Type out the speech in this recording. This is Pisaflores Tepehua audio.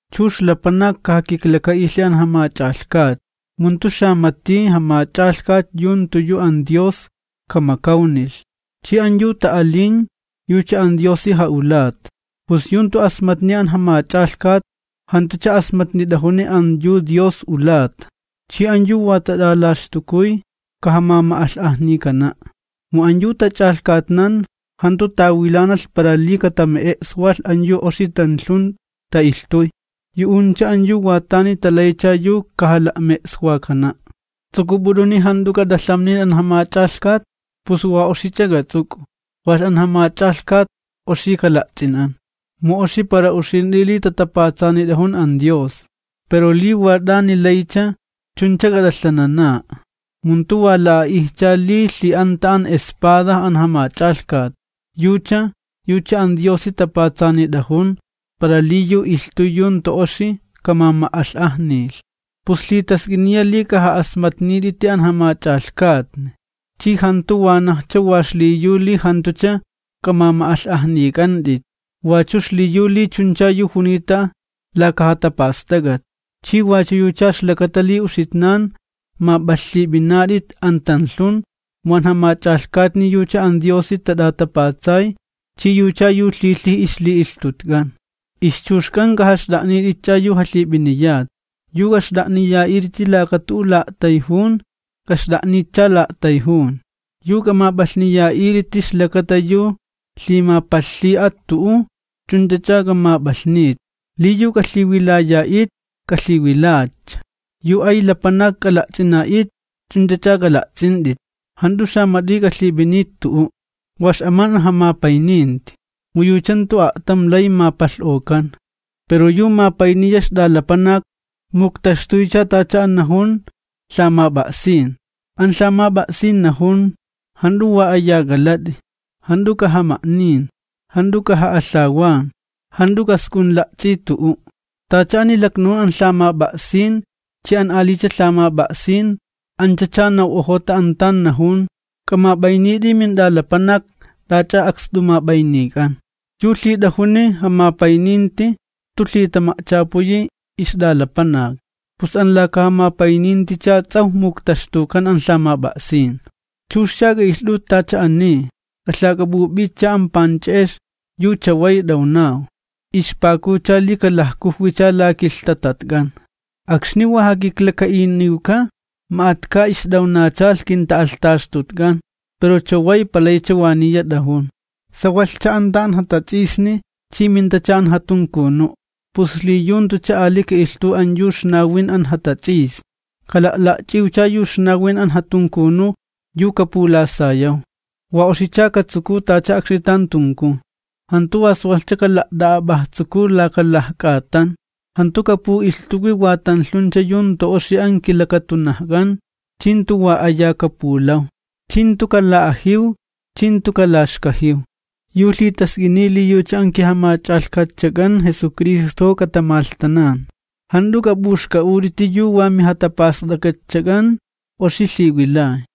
Chux lapanak kajakiklaka'ilhi an jamach'alhkatni, mu jantu xamati jamach'alhkat yu jantu yu an Dios kamakawnilh, chi an yu ta'alin, yucha an Diosi ja'ulata. Pus yu jantu asmatni an jamach'alhkat, jantucha asmatnit'ajuni an yu Dios ulata. Chi an yu wa tat'alaxtukuy, kajamama'alh'ajnikana', mu an yu tach'alhkatnan jantu tawilanalh para li katame'e'swalh an yu oxi tanlhun ta'ilhtuy, yu'uncha an yu wa tani talaycha yu kajala'me'e'swakana'. ¿Ts'uk'up'ut'uni jant'u k'at'alhamnin an jamach'alhkat? Pus wa oxich'a k'ats'uk'u, walh an jamach'alhkat oxi kala'ts'inan, mu oxi para uxint'i li tatapats'anit'ajun an Dios. Pero li wa t'ani laycha, ch'unch'a k'at'alhanana'a. Mu jantu wa la'a'ijcha li lhi'anta an espada an jamach'alhkat, yucha, yucha an Diosi tapatsanit'ajun, para li yu ilhtuy yu jantu oxi kamama'alh'ajnilh. Pus lhitask'iniya li k'aja'asmatnit'iti an jamach'alhkatni, chi jantu wanajcha wa xliyu li jantucha k'amama'alh'ajnik'ant'it, wachu xliyu li chuncha yu junita laka jatapast'ak'at. Chi wachu yucha ixlakata li uxitnan map'alhlhip'inat'it an tanlhun, mu an jamach'alhkatni yucha an Diosi tat'atapatsay chi yucha yu lhilhij ixli'ilhtutk'an. Ixchuxk'an k'ajaxt'a'nitcha yu jalhip'iniyat. Yu k'axt'a'niya'it'iti laka tu'u la'a'tayjun, k'axt'a'nitcha la'a'tayjun, yu k'amap'alhniya'it'iti ixlakata yu lhimapalhlhi'at tu'u, chunchacha k'amap'alhnit. Li yu k'alhiwilaya'it, k'alhiwilatcha, yu ay lapanak k'ala'ts'ina'it, ch'unch'ach'a k'ala'ts'int'it. Jant'u xamat'i k'alhip'init tu'u', wa x'aman an jamapayninti, mu yucha jantu a'tam lay mapalh'okan, pero yu mapayniya ixt'alapanak muktaxtuycha tacha an najun lhamap'a'sin. An lhamap'a'sin najun: “Jant'u wa aya k'alat'i, jant'u k'ajama'nin, jant'u k'aja'alhawan, jant'u k'ask'unla'ts'i tu'u'.” Tacha ani laknajun an lhamap'a'sin chi an alicha lhamap'a'sin, anchacha naw'ojota an tan najun: “K'amap'aynit'i mint'alapanak t'ach'a akst'umap'aynik'an.” Yu lhit'ajuni jamapayninti jantu lhitama'chapuyi ixt'alapanak. Pus an laka jamapayninticha ts'awj muktaxtukan an lhamap'a'sin. Chuxcha k'a'ilht'ut tacha ani, k'alhak'ap'up'itcha an panch'e'ex yu chaway t'awnaw, ixpakucha li kalajkujwicha la kilhtatatk'an. Akxni wa jakiklaka'iniwka ma'atka ixt'awnachalh kinta'alhtaxtutk'an, pero chaway palaycha waniya t'ajun. Sawalhcha anta an jatats'isni chi mintacha an jatunkunu', pus xliyu jantucha ali ka'ilhtuw an yu ixnawin an jatats'isni, kala'la'ch'iwcha yu ixnawin an jatunkunu yu kapulasayaw. Wa oxicha katsukuw, tacha akxni tan tunkuw. Jantu wa sawalhcha kala't'a'ap'ajtsukuw laka lajk'atan. Jantu kapu'ilhtuwi wa tanlhuncha yu jantu oxi an kilakatunajk'an, chi jantu wa aya kapulaw. Chi jantu kala'ajiw chi jantu kalaxkajiw. Yu lhitask'iniy li yucha an kiJamach'alhkatchak'an Jesucristojo katamalhtanan, jant'u k'ap'uxk'a'ut'iti yu wa mijatapast'ak'atchak'an oxi lhiwilay.